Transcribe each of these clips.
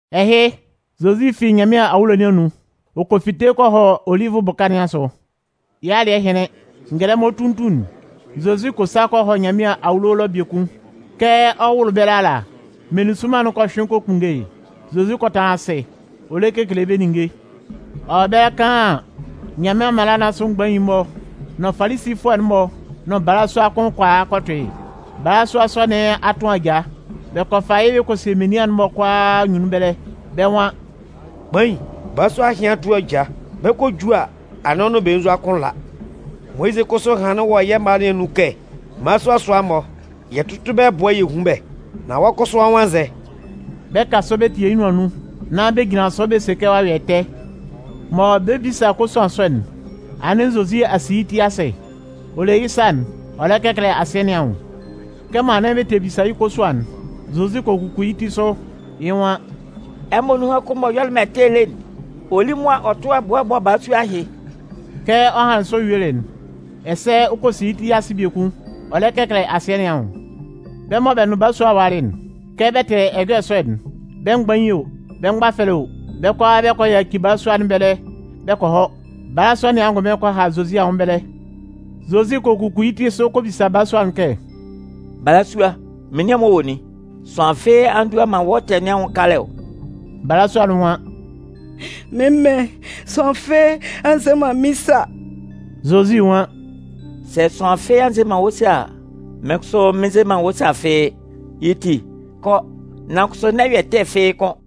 Ɛhɩ, Zozi fi Nyanmɩan awulo nɩn anun, ɔ kɔ fite kɔ hɔ Olivʋ bʋka nɩn asʋ. Yɩ́ alɩ́ɛ hɩnlɩn, ngɛlɛmɔ tutun'n, Zozi kɔ sa kɔ hɔ Nyanmɩan awulo ɛlɔ biekun. Kɛ ɔ 'wʋlʋ ɛbɛlɛ ala, meninsʋnman'n kɔ hyʋɩn kɔ kpunnge yɩ́. Zozi kɔ tanlan asɩ ɔ lɛ kekele bɛ́ ninnge. Ɔ wɔ ɛbɛlɛ kaan an, Nyanmɩan mala nɩn asʋ mgbain'n-mɔ nʋn Falisifʋɛ'n-mɔ nʋn balasua kʋn kɔ a kɔ tʋ yɩ́. Balasua sɔ nɩn a tʋn aja. Bɛ kɔ fa yɩ́ bɛ kɔ sie menian'n-mɔ kʋalaa anyunnun ɛbɛlɛ. Bɛ́ nwan: “Kpain, balasua ɛhɩ a tʋn aja. Bɛ 'kɔ ju a, anɩn ɔ nʋn belenzua kʋn la. Moyizɩ kʋsʋ hanlɩn wɔ yɛ́ mala nɩn anun kɛ mmalasua sʋa-mɔ, yɛ tʋ́tʋ bɛ́ ɛbʋɛ yɛ hún bɛ́. Nan wɔ́ kʋsʋ, wɔ́ nwan nzɛ?” Bɛ 'kan sɔ bɛ tetie yɩ́ nʋan nun nán bɛ jinlan sʋ bɛ se kɛ ɔ'a yɔ ɛtɛ. Mɔ bɛ 'bisa kosuan sɔ'n, anɩn Zozi a si yɩ́ ti asɩ. Ɔ le yɩ́ sa'n ɔ lɛ kɛkɛlɛ asɩɛ nɩn anwʋn. Kɛmɔ anɩn bɛ tɛ bisa yɩ́ kosuan'n, Zozi kɔ kuku yɩ́ ti sʋ, yɩ́ nwan: “Ɛmɔ nunhan kʋn m'ɔ yɔlɩ man ɛtɛ lé'n, ɔ lí mʋa ɔ tʋ́ ɛbʋɛ bɔ́ balasua ɛhɩ.” Kɛ ɔ hanlɩn sɔ yuelɩ'n, ɛsɛ ɔ kɔ si yɩ́ ti asɩ biekun ɔ lɛ kɛkɛlɛ asɩɛ nɩn anwʋn. Bɛ́ mɔ bɛ nʋn balasua'n walɩ'n, kɛ bɛ tɩlɩ ɛjɔlɛ sɔ'n, bɛ́ mgbain o, bɛ́ mgbafɛlɛ o, bɛ́ kʋalaa bɛ kɔ yaci balasua nɩn ɛbɛlɛ bɛ kɔ hɔ. Balasua nɩn angʋnmɩn kɔ ha Zozi anwʋn ɛbɛlɛ. Zozi kɔ kuku yɩ́ ti sʋ ɔ kɔ bisa balasua'n kɛ: “Balasua, menian'n-mɔ wɔ nin? Sʋanlan fɩ́ɩ́ a ndua man wɔ́ ɛtɛ nɩn anwʋn kalɛ ɔ?” Balasua'n nwan: “Mɩ́n mɩn, sʋanlan fɩ́ɩ́ a nze man mɩ́n sa.” Zozi nwan: “Sɛ sʋanlan fɩ́ɩ́ a nze man wɔ́ sa a, mɩ́n kʋsʋ mɩn nze man wɔ́ sa fɩ́ɩ́. Yɩ́ ti, kɔ, nan kʋsʋ n'ɛ yɔ ɛtɛ fɩ́ɩ́ kʋ́n.”]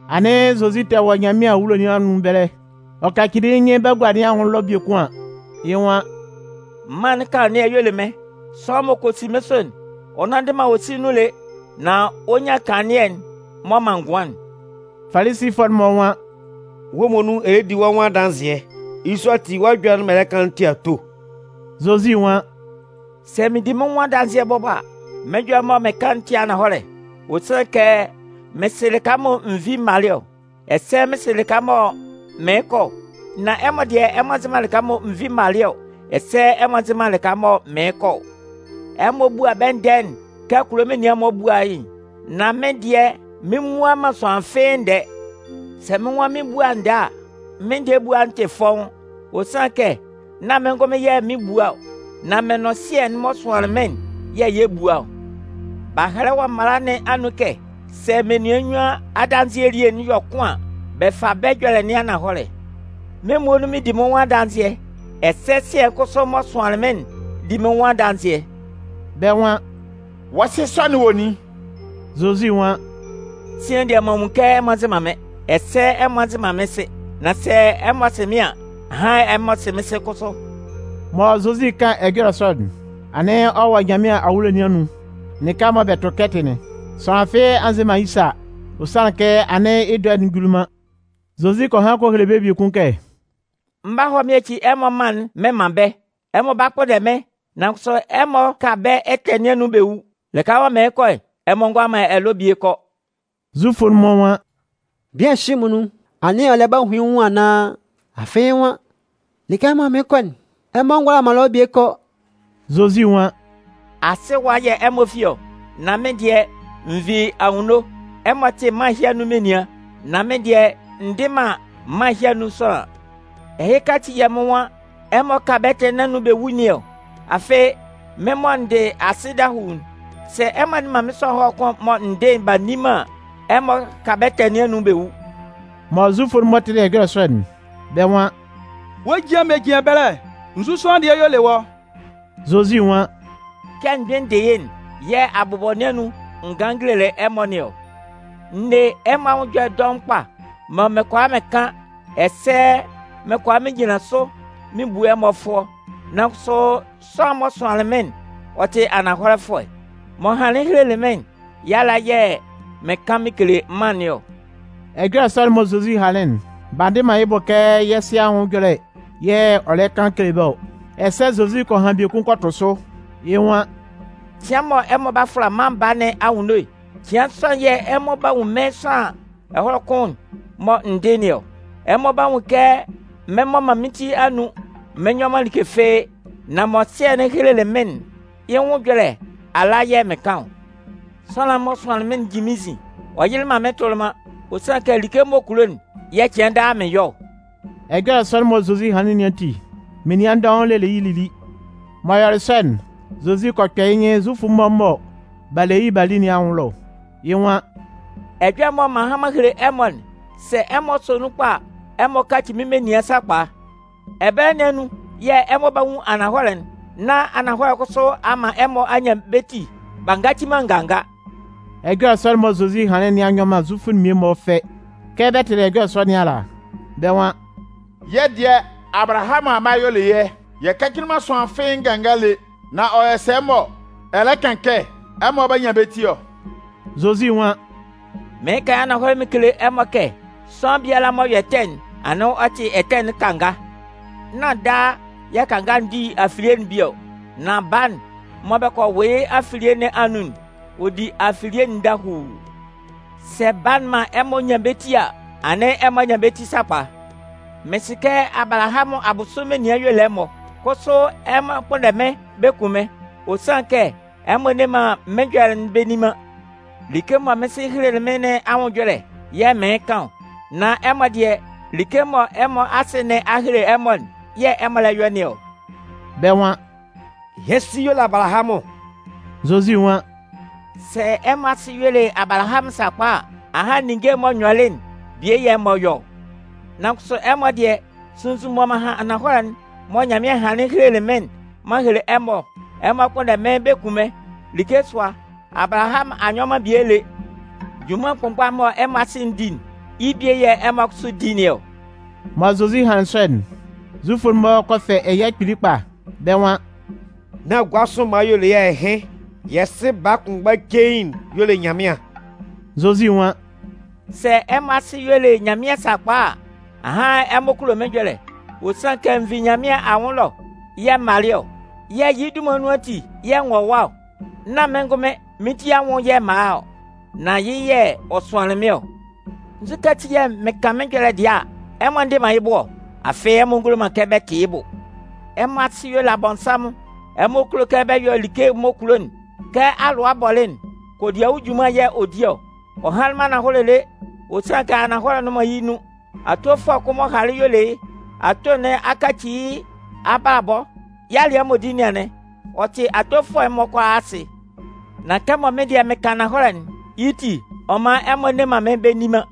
Anɩn Zozi tɛ wɔ Nyanmɩan awulo nɩn anun ɛbɛlɛ. Ɔ kacili yɩ́ nyɩn bagua nɩn anwʋn ɛlɔ biekun an, yɩ́ nwan: “Mân'n kanlannɩɛ'n y'ɔ le mɩ́n. Sʋanlan m'ɔ kɔ si mɩ́n sʋ'n, ɔ nnanndɩ man awosin nun lé, nan ɔ 'nyan kanlannɩɛ'n m'ɔ man ngʋan'n.” Falisifʋɛ'n-mɔ nwan: “Wɔ́ muonun ɛ lɛ di wɔ́ nwʋn adanzɩɛ, yɩ́ sɔ ati wɔ́ ɛjɔlɛ'n mɔ ɛ lɛ kan'n tɩ ato.” Zozi nwan: “Sɛ mɩɩn di mɩ́n nwʋn adanzɩɛ bɔbɔ a, mɩ́n ɛjɔlɛ'n mɔ mɩɩn kan'n tɩ ananhɔlɛ. Ɔ sanlɩn kɛ mɩn sɩ lɩka mɔ n vi m malɩ ɔ, ɛsɛ mɩn sɩ lɩka mɔ mɩɩn kɔ ɔ. Nan ɛmɔ dɩɛ, ɛmɔ nzɩ man lɩka mɔ n vi m malɩ ɔ, ɛsɛ ɛmɔ nzɩ man lɩka mɔ mɩɩn kɔ ɔ. Ɛmɔ bua bɛ́ ndɛɛ'n kɛ kulo menian'n-mɔ bua yɩ́'n. Nan mɩ́n dɩɛ, mɩn mmua man sʋanlan fɩ́ɩ́ ndɛɛ. Sɛ mɩ́n nwan mɩn 'bua ndɛɛ a, mɩ́n ndɛɛ ebua'n tɩ fɔ́ʋ́n. Ɔ sanlɩn kɛ nán mɩ́n ngʋnmɩn yɛ̂ mɩn 'bua ɔ, nan mɩn nʋn Sɩɛ'n m'ɔ sʋanlɩn mɩ́n'n yɛ̂ yɛ 'bua ɔ. B'a hɛlɛ wɔ mala nɩn anun kɛ sɛ menian nnyuan adanzɩɛ elie'n yɔ kʋn an, bɛ fa bɛ́ ɛjɔlɛ nɩn ananhɔlɛ. Mɩ́n muonun mɩɩn di mɩ́n nwʋn adanzɩɛ, ɛsɛ Sɩɛ'n kʋsʋ m'ɔ sʋanlan mɩ́n'n di mɩ́n nwʋn adanzɩɛ.” Bɛ́ nwan: “Wɔ́ sɩ sɔ'n wɔ nin?” Zozi nwan: “Sian dɩɛ, m'an nwun kɛ ɛmɔ nzɩ man mɩ́n, ɛsɛ ɛmɔ nzɩ man mɩ́n Sɩ. Nan sɛ ɛmɔ sɩ mɩ́n an, ahan ɛmɔ sɩ mɩ́n Sɩ kʋsʋ.” Mɔ Zozi 'kan ɛjɔlɛ sɔ'n, anɩn ɔ wɔ Nyanmɩan awulo nɩn anun lɩka mɔ bɛ tʋ kɛtɩ'n. Sʋanlan fɩ́ɩ́ a nze man yɩ́ sa, ɔ sanlɩn kɛ anɩn yɩ́ dɔɛ'n juli man. Zozi kɔ han kɔ hele bɛ́ biekun kɛ: “Mɩn 'ba hɔ mɩn yaci ɛmɔ mân'n mɩn man bɛ́. Ɛmɔ 'ba kpʋnndɛ mɩ́n, nan kʋsʋ ɛmɔ 'ka bɛ́ ɛtɛ nɩn anun bɛ wu. Lɩka mɔ mɩɩn kɔ'n, ɛmɔ ngʋala man ɛlɔ bie kɔ.” Zufʋ'n-mɔ nwan: “Bian ɛhɩ muonun, anɩn ɔ lɛ ba hun yɩ́ nwʋn anaan? Afɩ yɩ́ nwan: ‘Lɩka mɔ mɩɩn kɔ'n, ɛmɔ ngʋala man ɛlɔ bie kɔ.’” Zozi nwan: “Asɩ ɛwa yɛ̂ ɛmɔ fi ɔ, nan mɩ́n dɩɛ, n vi anwunno. Ɛmɔ tɩ mân ɛhɩ anun menian, nan mɩ́n dɩɛ, n dɩ man mân ɛhɩ anun sʋanlan. Ɛhɩka ati yɛ̂ mɩ́n nwan ɛmɔ 'ka bɛ́ ɛtɛ nɩn anun bɛ wu nɩn ɔ. Afɩ mɩ́n mɔ n dɩ asɩ dahuu'n, sɛ ɛmɔ a nne man mɩ́n sʋanlan ɛhɔlɛ kʋn'n mɔ n dɩ'n b'a nni man an, ɛmɔ 'ka bɛ́ ɛtɛ nɩn anun bɛ wu.” Mɔ Zufʋ'n-mɔ tɩlɩ ɛjɔlɛ sɔ'n, bɛ́ nwan: “Wɔ́ ejian mɔ ɛ jin ɛbɛlɛ'n, nzu sʋanlan dɩɛ y'ɔ le wɔ́?” Zozi nwan: “Kɛ m gbɩn n dɩ yɩ́'n yɛ̂ abʋbɔ nɩn anun n ganlɩn n gelelɩ ɛmɔ nɩn ɔ. N ne ɛmɔ anwʋn ɛjɔlɛ dɔʋn kpa mɔ mɩn kʋala mɩn kan ɛsɛ mɩn kʋala mɩn jinlan sʋ mɩn bu ɛmɔ fʋɔ. Nan kʋsʋ sʋanlan'n m'ɔ sʋanlɩn mɩ́n'n, ɔ tɩ ananhɔlɛfʋɛ. M'ɔ hanlɩn helelɩ mɩ́n'n, yɩ́ ala yɛ̂ mɩn kan mɩn kele mân nɩn ɔ.” Ɛjɔlɛ sɔ'n mɔ Zozi hanlɩn'n, b'a ndɩ man yɩ́ bʋ kɛ yɩ́ Sɩ anwʋn ɛjɔlɛ yɛ̂ ɔ lɛ kan kele bɛ́ ɔ. Ɛsɛ Zozi kɔ han biekun kɔ tʋ sʋ, yɩ́ nwan: “Cɩan mɔ ɛmɔ 'ba fʋla Mân Baa nɩn anwunno'n, cɩan sɔ'n yɛ̂ ɛmɔ 'ba nwun mɩ́n sʋanlan ɛhɔlɛ kʋn'n mɔ n dɩ nɩn ɔ. Ɛmɔ 'ba nwun kɛ mɩn mmɔ man mɩ́n ti anun mɩn nyɔ man like fɩ́ɩ́, nan mɔ Sɩɛ'n helelɩ mɩ́n'n, yɩ́ nwʋn ɛjɔlɛ ala yɛ̂ mɩn kan ɔ. Sʋanlan'n m'ɔ sʋanlɩn mɩ́n'n jin mɩ́n nzin. Ɔ yɩlɩ man mɩ́n tʋlɩ man, ɔ sanlɩn kɛ like m'ɔ kulo'n yɛ̂ cɩan daa mɩn yɔ ɔ.” Ɛjɔlɛ sɔ'n mɔ Zozi hanlɩn nɩn ati, menian dɔʋn lelɩ yɩ́ lili. M'ɔ yɔlɩ sɔ'n, Zozi kɔ kpɛ yɩ́ nyɩn Zufʋ'n-mɔ mɔ b'a le yɩ́ b'a li'n-mɔ anwʋn ɛlɔ, yɩ́ nwan: “Ɛjɔlɛ'n mɔ m'an han m'an hele ɛmɔ'n, sɛ ɛmɔ sɔ nun kpa a, ɛmɔ 'kaci mɩ́n menian sakpa. Ɛbɛlɛ nɩn anun yɛ̂ ɛmɔ 'ba nwun ananhɔlɛ'n, nán ananhɔlɛ'n kʋsʋ a man ɛmɔ a nyan bɛ́ ti b'a ngaci man nganga.” Ɛjɔlɛ sɔ'n mɔ Zozi hanlɩn nɩn a nyɔ man Zufʋ'n mmie-mɔ fɛ. Kɛ bɛ tɩlɩ ɛjɔlɛ sɔ nɩn ala, bɛ́ nwan: “Yɛ́ dɩɛ, Abalahamʋn amma y'ɔ le yɛ́. Yɛ kacili man sʋanlan fɩ́ɩ́ nganga lé. Nan ɔ yɔ sɛ mɔ ɛ lɛ kan kɛ ɛmɔ 'ba nyan bɛ́ ti ɔ?” Zozi nwan: “Mɩɩn kan yɩ́ ananhɔlɛ mɩn kele ɛmɔ kɛ sʋanlan biala m'ɔ yɔ ɛtɛ'n, anɩn ɔ tɩ ɛtɛ'n kanga. Nán daa yɛ̂ kanga'n di afilie'n bie ɔ. Nan baa'n mɔ bɛ kɔ wʋ yɩ́ afilie nɩn anun'n, ɔ di afilie'n dahuu. Sɛ Baa'n man ɛmɔ nyan bɛ́ ti a, anɩn ɛmɔ a nyan bɛ́ ti sakpa. Mɩn sɩ kɛ Abalahamʋn abʋsʋ menian y'ɔ le ɛmɔ. Kʋsʋ ɛmɔ 'kpʋnndɛ mɩ́n bɛ kun mɩ́n, ɔ sanlɩn kɛ ɛmɔ nne man mɩ́n ɛjɔlɛ'n bɛ nni man. Like mɔ mɩ́n Sɩ helelɩ mɩ́n nɩn anwʋn ɛjɔlɛ yɛ̂ mɩɩn kan ɔ. Nan ɛmɔ dɩɛ, like mɔ ɛmɔ asɩ nɩn a hele ɛmɔ'n yɛ̂ ɛmɔ lɛ yɔ nɩn ɔ.” Bɛ́ nwan: “Yɛ́ sɩ yɔ le Abalahamʋn.” Zozi nwan: “Sɛ ɛmɔ asɩ y'ɔ le Abalahamʋn sakpa a, ahan yɩ́ ninnge'n m'ɔ yɔlɩ'n, bie yɛ̂ ɛmɔ yɔ ɔ. Nan kʋsʋ ɛmɔ dɩɛ, sunnzun mɔ m'an han ananhɔlɛ'n mɔ Nyanmɩan hanlɩn helelɩ mɩ́n'n m'an hele ɛmɔ ɔ, ɛmɔ 'kpʋnndɛ mɩ́n kun mɩ́n. Like sʋa, Abalahamʋn a nyɔ man bie lé. Junman kʋnmgba'n mɔ ɛmɔ asɩ'n di'n, yɩ́ bie yɛ̂ ɛmɔ kʋsʋ di nɩn ɔ.” Mɔ Zozi hanlɩn sɔ'n, Zufʋ'n-mɔ kɔ fɛ ɛya kpili kpa. Bɛ́ nwan: “Nán gua sʋ mma y'ɔ le yɛ́ ɛɩn! Yɛ́ Sɩ baa kʋnmgba cein'n y'ɔ le Nyanmɩan.” Zozi nwan: “Sɛ ɛmɔ asɩ y'ɔ le Nyanmɩan sakpa a, ahan ɛmɔ kulo mɩ́n ɛjɔlɛ. Ɔ sanlɩn kɛ n vi Nyanmɩan anwʋn ɛlɔ yɛ̂ m malɩ ɔ. Yɛ̂ yɩ́ dunman nun ati yɛ̂ n wɔ ɛwa ɔ. Nán mɩ́n ngʋnmɩn mɩ́n ti anwʋn yɛ̂ m'an a ɔ. Nan yɩ́ yɛ̂ ɔ sʋanlɩn mɩ́n ɔ. Nzukɛ ati yɛ̂ mɩn kan mɩ́n ɛjɔlɛ dɩɛ a, ɛmɔ ndɩ man yɩ́ bʋ ɔ? Afɩ ɛmɔ ngʋala man kɛ bɛ tɩ yɩ́ bʋ. Ɛmɔ asɩ y'ɔ le Abɔnsanmʋn. Ɛmɔ kulo kɛ bɛ yɔ like m'ɔ kulo'n. Kɛ alʋa bɔlɩ'n, kodiawu junman y'ɔ di ɔ. Ɔ hanlɩn man ananhɔlɛ lé, ɔ sanlɩn kɛ ananhɔlɛ nnʋn man yɩ́ nun. Atofʋɛ kʋn m'ɔ halɩ'n y'ɔ le yɩ́. Ato nɩn a kaci yɩ́ abalabɔ, yɩ́ alɩɛ m'ɔ di nɩn anɩn. Ɔ tɩ atofʋɛ'n-mɔ kʋalaa asɩ. Nan kɛmɔ mɩ́n dɩɛ mɩn kan ananhɔlɛ'n, yɩ́ ti, ɔ man ɛmɔ nne man mɩ́n bɛ nni man.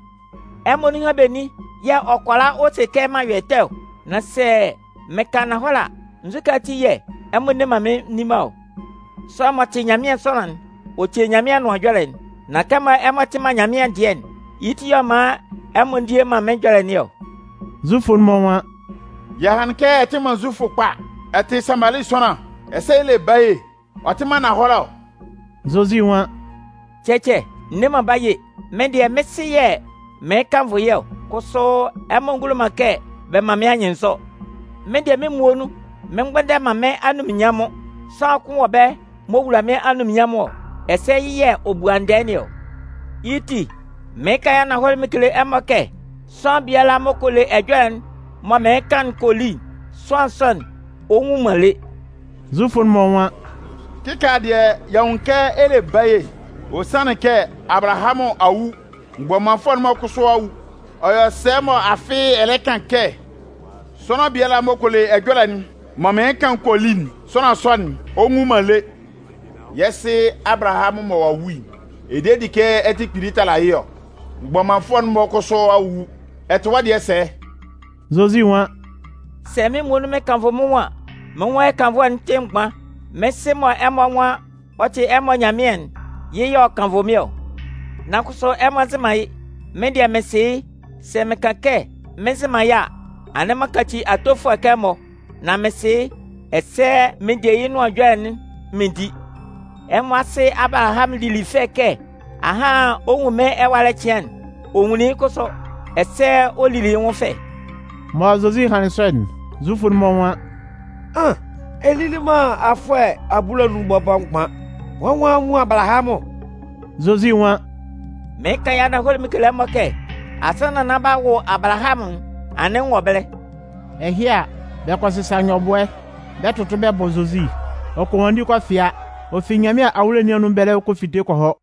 Ɛmɔ nunhan benin yɛ̂ ɔ kʋala ɔ se kɛ m'an yɔ ɛtɛ ɔ? Nan sɛ mɩn kan ananhɔlɛ a, nzukɛ ati yɛ̂ ɛmɔ nne man mɩ́n nni man ɔ? Sʋanlan m'ɔ tɩ Nyanmɩan sʋanlan'n, ɔ tie Nyanmɩan anʋan ɛjɔlɛ'n. Nan kɛmɔ ɛmɔ tɩ man Nyanmɩan dɩɛ'n, yɩ́ ti yɛ̂ ɔ man ɛmɔ ndie man mɩ́n ɛjɔlɛ nɩn ɔ.” Zufʋ'n-mɔ nwan: “Yɛ hanlɩn kɛ ɛ tɩ man Zufʋ kpa, ɛ tɩ Samali sʋanlan, ɛsɛ ɛ le baye, ɔ tɩ man ananhɔlɛ ɔ?” Zozi nwan: “Cɛcɛ, n ne man baye. Mɩ́n dɩɛ, mɩ́n Sɩ yɛ̂ mɩɩn kannvʋ yɩ́ ɔ. Kʋsʋ ɛmɔ ngulo man kɛ bɛ man mɩ́n anyɩnnzɔ. Mɩ́n dɩɛ mɩ́n muonun mɩn mgbʋnndɛ man mɩ́n anunminnyanmʋn. Sʋanlan kʋn wɔ ɛbɛlɛ m'ɔ wula mɩ́n anunminnyanmʋn ɔ. Ɛsɛ yɩ́ yɛ̂ ɔ bua ndɛɛ nɩn ɔ. Yɩ́ ti, mɩɩn kan yɩ́ ananhɔlɛ mɩn kele ɛmɔ kɛ sʋanlan biala m'ɔ kɔ le ɛjɔlɛ'n mɔ mɩɩn kan'n kɔ li'n, sʋanlan sɔ'n, ɔ nwu man lé.” Zufʋ'n-mɔ nwan: “Kɩkaala dɩɛ, y'a nwun yɩ́ kɛ ɛ le baye. Ɔ sanlɩn kɛ Abalahamʋn a wu, mgbɔmanfʋɛ'n-mɔ kʋsʋ a wu. Ɔ yɔ sɛ mɔ afɩ ɛ lɛ kan kɛ: ‘Sʋanlan biala m'ɔ kɔ le ɛjɔlɛ'n mɔ mɩɩn kan'n kɔ li'n, sʋanlan sɔ'n, ɔ nwun man le.’ Yɛ́ sɩ Abalahamʋn mɔ ɔ'a wu'n, ɛ de di kɛ ɛ tɩ kpili tala yɩ́ ɔ? Mgbɔmanfʋɛ'n-mɔ kʋsʋ a wu. Ɛ tɩ wɔ́ dɩɛ sɛ?” Zozi nwan: “Sɛ mɩ́n muonun mɩn kannvʋ mɩ́n nwʋn an, mɩ́n nwʋn ɛkannvʋɛ'n tɩ mgban. Mɩ́n Sɩ mɔ ɛmɔ nwan ɔ tɩ ɛmɔ Nyanmɩan'n, yɩ́ yɛ̂ ɔ kannvʋ mɩ́n ɔ. Nan kʋsʋ, ɛmɔ nzɩ man yɩ́. Mɩ́n dɩɛ, mɩn sɩ yɩ́. Sɛ mɩn kan kɛ mɩn nzɩ man yɩ́ a, anɩn m'an kaci atofʋɛ kɛ ɛmɔ. Nan mɩn sɩ yɩ́, ɛsɛ mɩn de yɩ́ nʋan ɛjɔlɛ'n mɩn di. Ɛmɔ asɩ Abalahamʋn lili fɛ kɛ ahan ɔ nwunlɩn mɩ́n ɛwalɛ cɩan'n. Ɔ nwunlin yɩ́ kʋsʋ, ɛsɛ ɔ lili yɩ́ nwʋn fɛ.” Mɔ Zozi hanlɩn sɔ'n, Zufʋ'n-mɔ nwan: “An! Ɛ lili man afʋɛ abulanun bɔbɔ mgban, wɔ́ nwan a nwun Abalahamʋn.” Zozi nwan: “Mɩɩn kan yɩ́ ananhɔlɛ mɩn kele ɛmɔ kɛ, asannan nán b'a wʋ Abalahamʋn'n, anɩn n wɔ ɛbɛlɛ.” Ɛhɩ a, bɛ kɔ sɩsa nyɔbʋɛ, bɛ 'tʋtʋ bɛ bɔ Zozi. Ɔ kɔ nwanndi kɔ fɩa, ɔ fi Nyanmɩan awulo nɩn anun ɛbɛlɛ ɔ kɔ fite kɔ hɔ.